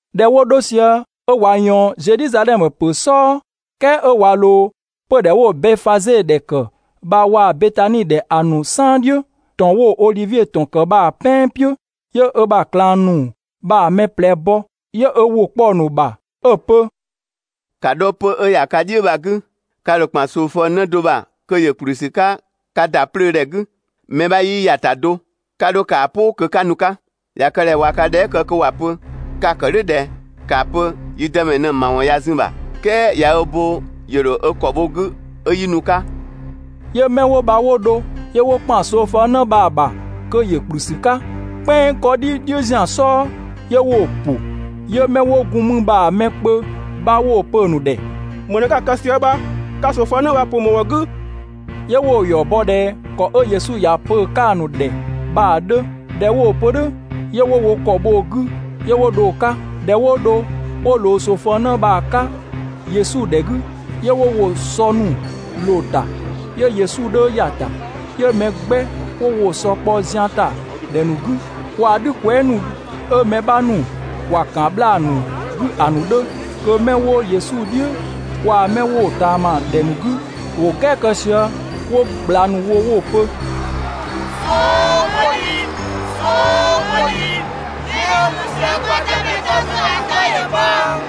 ꞊Dhɛ 'wo 'dho sië 'ö ꞊wa ꞊yɔɔn Zedhizadhɛmö ‑pö "sɔɔ, "kɛɛ 'ö ꞊wa ꞊loo 'pödhɛ 'wo Bɛfaze ‑dhɛ ‑kë bha waa‑ Betani ‑dhɛ ‑a ‑nu "saan "dhiʋ̈, ‑tɔn 'wo‑ Odhivie ‑tɔn ‑kë bha‑ "pɛan "piʋ̈, 'yö ö ‑bha ꞊klang ‑nu bha‑ mɛ ꞊plɛ bɔ. 'Yö ö ‑wʋ kpɔ‑ ‑nu ‑bha 'ö‑ pö: «‑Ka 'dho 'pö‑ 'ö ‑ya ka "dhiʋ̈ bha‑ 'gü, ka ‑dho ‑kpan ꞊soofëng 'në do ‑bha kö ‑yö ‑kplü ‑sü 'ka ka ‑da 'plöö ‑dhɛ 'gü, mɛ 'bha 'yii ‑ya ‑ta do, 'ka 'dho ‑kaa "pʋ kö 'ka nu‑ 'ka. ꞊Ya kë ꞊dhɛ ꞊wa ka dhɛɛ" kë kö ‑wa pö: ‹Ka‑ ‑kë "dhʋ̈ ꞊dhɛ?› ‑kaa pö: ‹Yi Dëmɛ ꞊në‑ ‑mawɔn ꞊ya zun‑ ‑bha, "kɛɛ ꞊ya ö bo ‑yö ‑dho ö ‑kɔ bho‑ 'gü 'ö 'yi nu‑ 'ka.›» 'Yö 'mɛ 'wo bha 'wo dho, 'yö 'wo ‑kpan ꞊soofëng 'në bha‑ ‑bha kö ‑yö ‑kplü ‑sü 'ka "kpɛnng 'kɔdhi "dhiʋ̈ zian "sɔɔ, 'yö 'wo‑ ‑pʋ. 'Yö 'mɛ 'wo gun mü bha‑ mɛ kpö 'bha 'wo‑ pö‑ ‑nu ‑dhɛ: «‑Më ꞊në 'ka‑ kë sië bha? Ka ꞊soofëng 'në bha‑ ‑pʋ ‑më ‑wɔn 'gü?» 'Yö 'wo‑ ‑yɔ bɔ ꞊dhɛ ‑kɔ 'ö Yesu ‑ya pö‑ 'ka‑ ‑nu ‑dhɛ bha‑ 'dhö. ꞊Dhɛ 'wo‑ pö "dhʋ̈ 'yö 'wo wo ‑kɔ bho‑ 'gü, 'yö 'wo dho‑ 'ka. ꞊Dhɛ 'wo dho 'wo ꞊loo ꞊soofëng 'në bha‑ 'ka Yesu ‑dhɛ 'gü, 'yö 'wo woo‑ sɔ ‑nu ꞊loo‑ ‑ta, 'yö Yesu 'dhö ‑ya ‑ta. 'Yö mɛ 'gbɛ 'wo woo‑ sɔ kpɔ zian ‑ta ‑dhɛ ‑nu 'gü, waa‑ "dhü kwɛɛ" ‑nu 'ö mɛ 'bha ‑nu ‑wa ‑kan 'bhlaa‑ ‑nu 'gü ‑a ‑nu 'dhö. Kö 'mɛ 'wo Yesu "dhiʋ̈ waa‑ 'mɛ 'wo‑ ꞊taama ‑dhɛ ‑nu 'gü, ‑wo "gɛɛ kë sië 'wo ꞊gbla ‑nu wo 'wo‑ pö: "Sookwedhi! "Sookwedhi! 'Mɛ 'ö nu sië kwa Dëmɛ ‑bha nu 'gü bha‑ 'tɔ ‑yö bhɔ!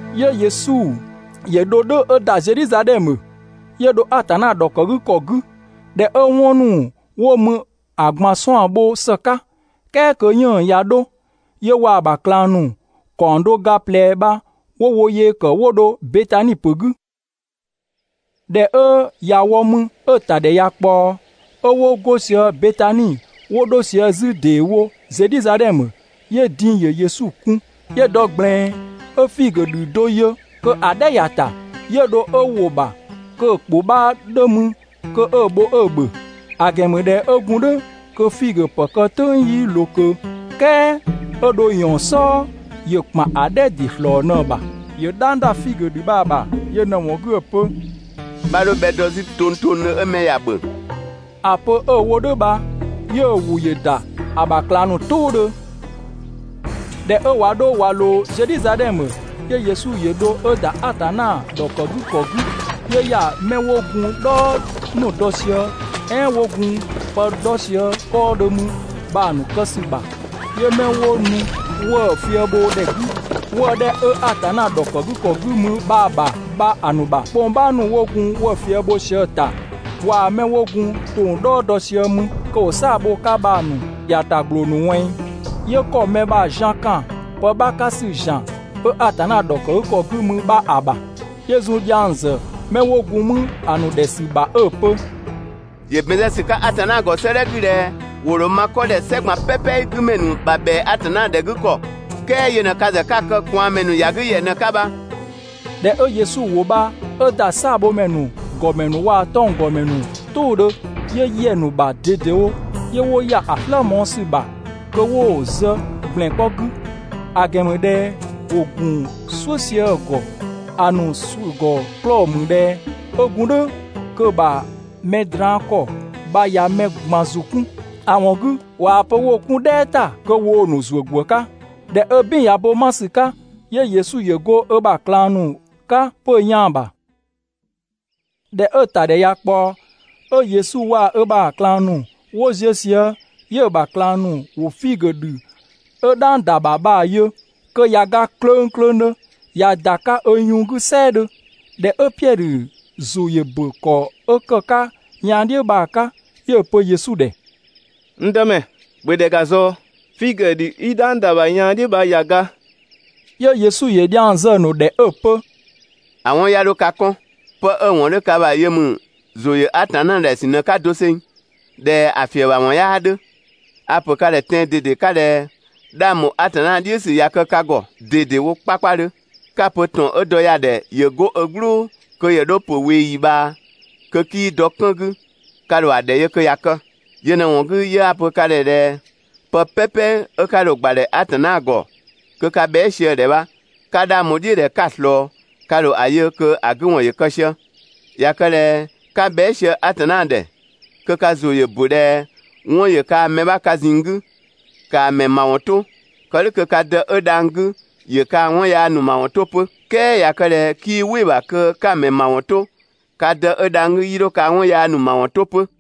'Yö Yesu ‑yö dho "dhʋ̈ 'ö ‑da Zedhizadhɛmö, 'yö dho Atanna ‑dhɔkëgükɔ 'gü. ꞊Dhɛ 'ö 'wɔn ‑nu 'wo mü ‑a ꞊gban 'suan‑ bho ‑së 'ka, "kɛɛ kö 'yënng‑ ꞊ya 'dho, 'yö waa‑ ‑bha ꞊klang ‑nu ‑kaɔng do ga ꞊plɛ bha 'wo wo yee ‑kë 'wo dho Betani ‑pö 'gü. ꞊Dhɛ 'ö ꞊ya wɔ mü 'ö‑ ‑tadhɛ ꞊ya ꞊kpaɔ, 'ö 'wo 'go sië Betani 'wo 'dho sië 'zü ‑deewo Zedhizadhɛmö, 'yö din‑ ‑yö Yesu kun. 'Yö dɔ ꞊gblɛɛn 'ö figö ‑dhü do yö kö‑ "dhɛ ‑ya ‑ta, 'yö dho 'ö ‑wo ‑bha kö‑ ‑kpʋ 'bha 'dhö mü kö 'ö‑ bho 'ö‑ ‑bhö, (‑a ‑gɛn ‑mü ꞊dhɛ 'ö gun "dhʋ̈ kö figö ‑pë kë "tʋ̈ng 'yii ꞊loo ꞊kö), "kɛɛ 'ö 'dho ꞊yɔɔn‑ "sɔɔ ‑yö ‑kpan ‑a "dhɛ ‑dɩ ‑slɔɔ ꞊në‑ ‑bha. ‑Yö "dhang ‑da figö ‑dhü bha‑ ‑bha yö ꞊në‑ ‑wɔn 'gü 'ö‑ pö: «'Bha 'dho bhɛ dɔ 'zü tongtongdhö 'ö mɛ ‑ya ‑bhö!» ‑A pö 'ö‑ wo "dhʋ̈ bha, 'yö‑ ‑wʋ ‑yö ‑da ‑a ‑bha ꞊klang ‑nu "tʋʋdhö. ꞊Dhɛ 'ö ꞊wa 'dho ꞊wa ꞊loo Zedhizadhɛmö, 'yö Yesu ‑yö dho 'ö ‑da Atanna ‑dhɔkëgükɔ 'gü. 'Yö ‑ya 'mɛ 'wo gun "dhɔɔ ‑nu dɔ sië, "ɛɛn 'wo gun pë 'dhɔ sië 'kɔɔdhö mü bha‑ ‑nu kë ‑sü ‑bha, 'yö 'mɛ 'wo nu 'wëë‑ fië bho ‑dhɛ 'gü 'wëë‑ 'dhɛ 'ö Atanna ‑dhɔkëgükɔ 'gü mü bha‑ ‑bha bha‑ ‑nu ‑bha 'kpongpaa ‑nu 'wo gun 'wëë‑ fië bho sië‑ ‑ta, waa‑ 'mɛ 'wo gun ‑tong "dhɔɔ dɔ sië mü (kö ‑wo "saa‑ bho‑ 'ka bha‑) ‑nu ‑yata ‑gbloo ‑nu ꞊wɛnng. 'Yö ‑kɔ mɛ ‑bha zian ‑kan pë 'bha 'ka ‑sü ‑zian 'ö Atanna ‑dhɔkëgükɔ 'gü mü bha‑ ‑bha. 'Yö zun dhiang ‑zë 'mɛ 'wo gun mü ‑a ‑nu ‑dhɛ ‑sü ‑bha 'ö‑ pö: «‑Yö ‑bɛn zë ‑sü 'ka Atanna ‑gɔ 'sëëdhɛ 'gü ꞊dhɛ: ‹‑Wo ‑dho ma 'kɔ ‑dhɛ "sɛ ꞊gban "pɛpɛ 'gü ‑mɛ ‑nu ‑bha ‑bhɛa Atanna ‑dhɛ 'gü ‑kɔ› "kɛɛ yö ꞊në ka ‑zë 'ka‑ kë ꞊kwaanmɛ ‑nu ‑ya 'gü ‑yɛ ꞊në‑ 'ka bha.» ꞊Dhɛ 'ö Yesu ‑wʋ bha 'ö ‑da "saabhomɛ ‑nu ‑gɔmɛ ‑nu waa‑ 'tɔnggɔmɛ ‑nu "tʋʋdhö, 'yö ‑yɛ ‑nu ‑bha ꞊dedewo, 'yö 'wo ‑ya ‑a "slë mɔɔ‑ ‑sü ‑bha kö 'wo‑ zë ‑gblɛn 'kpɔ 'gü. ‑A ‑gɛn ‑mü ꞊dhɛ ‑wo ‑gun "suʋ̈ sië‑ ‑gɔ, ‑a ‑nu ‑suʋ̈ ‑gɔ 'klɔɔ‑ ‑mü ꞊dhɛ 'ö gun "dhʋ̈ kö‑ ‑bha mɛ draan‑ ‑kɔ bha ꞊ya mɛ ꞊gban ‑zʋ 'kun, (‑a ‑wɔn 'gü ꞊waa‑ pö 'wo‑ 'kun "dhɛɛ ‑ta kö woo‑ ‑nu ‑zuö ‑gwë 'ka). ꞊Dhɛ 'ö "bin ꞊ya bo 'ma ‑sü 'ka, 'yö Yesu ‑yö go ö ‑bha ꞊klang ‑nu 'ka pö yaan‑ ‑bha. ꞊Dhɛ 'ö‑ ‑tadhɛ ꞊ya ꞊kpaɔ, 'ö Yesu waa‑ ö ‑bha ꞊klang ‑nu 'wo ziö sië, 'yö‑ ‑bha ꞊klang ‑nu 'wo figö ‑dhü 'ö "dhang ‑da ‑bha bha‑ yö kö ꞊ya ga klöngklöngdhö ꞊ya ‑da 'ka ‑a yun 'gü "sɛɛdhö. ‑Dhɛ 'ö Piɛdhö ‑zʋ ‑yö ‑bö ‑kɔ 'ö ‑kë 'ka yaan "dhiʋ̈ bha‑ 'ka, 'yö‑ pö Yesu ‑dhɛ: «N Dëmɛ, ‑bhö ‑dhɛ ‑ga ꞊zɔɔ, figö ‑dhü 'i "dhang ‑da ‑bha yaan "dhiʋ̈ bha ꞊ya ga.» 'Yö Yesu ‑yö dhiang zë‑ ‑nu ‑dhɛ 'ö‑ pö: «‑A 'wɔn 'ya 'dho ka 'kɔn. 'Pë 'ö‑ ‑wɔn 'dhö ka ‑bha yö ‑mü ‑zʋ ‑yö Atanna ‑dhɛ ‑sü ꞊në‑ 'ka doseng (꞊dhɛ‑ ‑fiëbhawɔn 'yaa 'dhö). A‑ ‑pö ka ‑dhɛ tɛan‑ ꞊dede 'ka ꞊dhɛ 'dhang ‑bho Atanna "dhiʋ̈ ‑sü ꞊ya kë ka ‑gɔ ꞊dedewo 'kpakpadhö, 'ka‑ pö ‑tɔn 'ö dɔ ya‑ ‑dhɛ ‑yö 'go ö "gblʋ̈ kö ‑yö 'dho ‑yö ‑pö ꞊weeyi ꞊bhaa, kö 'kii dɔ 'kën 'gü, ka ‑dho ‑a ‑dhɛ yö kö ꞊ya kë. Yö ꞊në‑ ‑wɔn 'gü 'yö 'a‑ pö ka ‑dhɛ pë "pɛpɛ 'ö 'ka dho‑ ‑gbadhɛ Atanna ‑gɔ kö ka bhɛa" sië‑ ‑dhɛ bha, ‑ka 'dhang bho‑ "dhiʋ̈ ꞊dhɛ 'ka‑ ꞊slɔɔ, ka ‑dho ‑a yö kö ‑a 'gü ‑wɔn ‑yö kë sië. ꞊Ya kë ꞊dhɛ 'ka bhɛa" sië Atanna ‑dhɛ, kö ka ‑zʋ ‑yö ‑bö ꞊dhɛ 'wɔn ‑yö kaa mɛ 'bha ka ꞊zinng 'gü, ‑kaa ‑mɛ ‑mawɔn 'to, kë "dhʋ̈ kö ka Dë 'ö dhang‑ 'gü ‑yö kaa‑ 'wɔn yaa ‑nu ‑mawɔn 'to 'pö. ["Kɛɛ ꞊ya kë ꞊dhɛ 'kii "wɩ‑ ‑bha kö 'ka‑ mɛ ‑mawɔn 'to, ka Dë 'ö dhang‑ 'gü, 'yii 'dho kaa‑ 'wɔn yaa ‑nu ‑mawɔn 'to 'pö.]»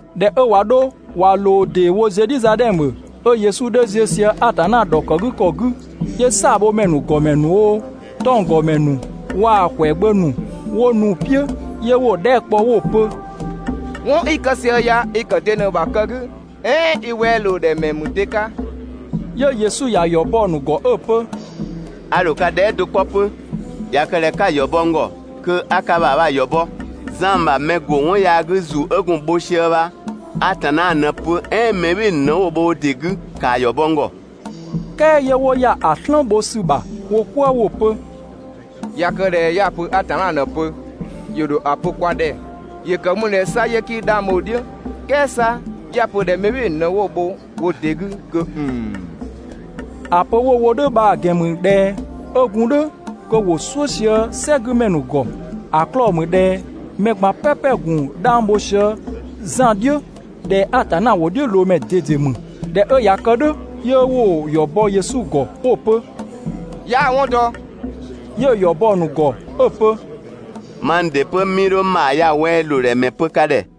꞊Dhɛ 'ö ꞊wa 'dho ꞊wa ꞊loo ‑deewo Zedhizadhɛmö, 'ö Yesu 'dhö ziö sië Atanna ‑dhɔkëgükɔ 'gü, 'yö "saabhomɛ ‑nu ‑gɔmɛ ‑nu oo, 'tɔnggɔmɛ ‑nu waa‑ ‑kwɛagbö ‑nu 'wo nu‑ "piʋ̈. 'Yö 'wo‑ dhɛɛ" kpɔ 'wo‑ pö: «'Wɔn 'i‑ kë sië ya, i‑ ‑kë de ‑bha kë 'gü? "Ɛɛn i wɛa ‑loo ‑dhɛ ‑mɛ ‑mü de 'ka?» 'Yö Yesu ‑ya ‑yɔ bɔ‑ ‑nu ‑gɔ 'ö‑ pö: «A ‑dho ka dhɛɛ" do 'kpɔ 'pö, ꞊ya kë ꞊dhɛ 'ka‑ ‑yɔ bɔ n ‑gɔ kö 'a ka ‑bha bha‑ ‑yɔ bɔ: Zan ‑bha mɛ ‑bɔ Atanna 'ka ‑zu 'ö gun‑ bho sië bha Atanna ꞊në‑ pö "ɛɛn mɛ "bhɩɩ‑ ‑nu ꞊në 'wo‑ bho wo ‑dɩ 'gü? ‑Kaa ‑yɔ bɔ n ‑gɔ!» "Kɛɛ 'yö 'wo ‑ya ‑a "slën bho ‑sü ‑bha wo "kwëë 'wo‑ pö: «꞊Ya kë ꞊dhɛ 'ya‑ pö Atanna ꞊në‑ pö, ‑yö ‑dho ‑a pö kwa ‑dhɛ: ‹‑Yö ‑kë mü ꞊dhɛ 'sa 'yö 'kii 'dhang bho‑ "dhiʋ̈?› "kɛɛ 'sa 'ya‑ pö ꞊dhɛ mɛ "bhɩɩ‑ ‑nu ꞊në 'wo‑ bho wo ‑dɩ 'gü kö ‑nnn!» (‑A pö 'wo wo "dhʋ̈ bha‑ ‑gɛn ‑mü ꞊dhɛ 'ö gun "dhʋ̈ kö ‑wo "suʋ̈ sië "sɛgümɛ ‑nu ‑gɔ, ‑a 'klɔɔ‑ ‑mü ꞊dhɛ mɛ ꞊gban "pɛpɛ‑ ‑gun 'dhang bho sië Zan "dhiʋ̈ ꞊dhɛ Atanna ‑wʋdhiʋ̈loomɛ ꞊dede ‑mü.) ꞊Dhɛ 'ö ꞊ya kë "dhʋ̈, 'yö 'wo‑ ‑yɔ bɔ Yesu ‑gɔ 'wo‑ pö: «'Yaa‑ 'wɔn dɔ.» 'Yö‑ ‑yɔ bɔ 'pö‑ ‑nu ‑gɔ 'ö‑ pö: «Mang ‑dɩ 'pö, 'mii 'dho n ‑bha ya‑ wɛa ‑loo ‑dhɛ ‑mɛ pö ka ‑dhɛ.»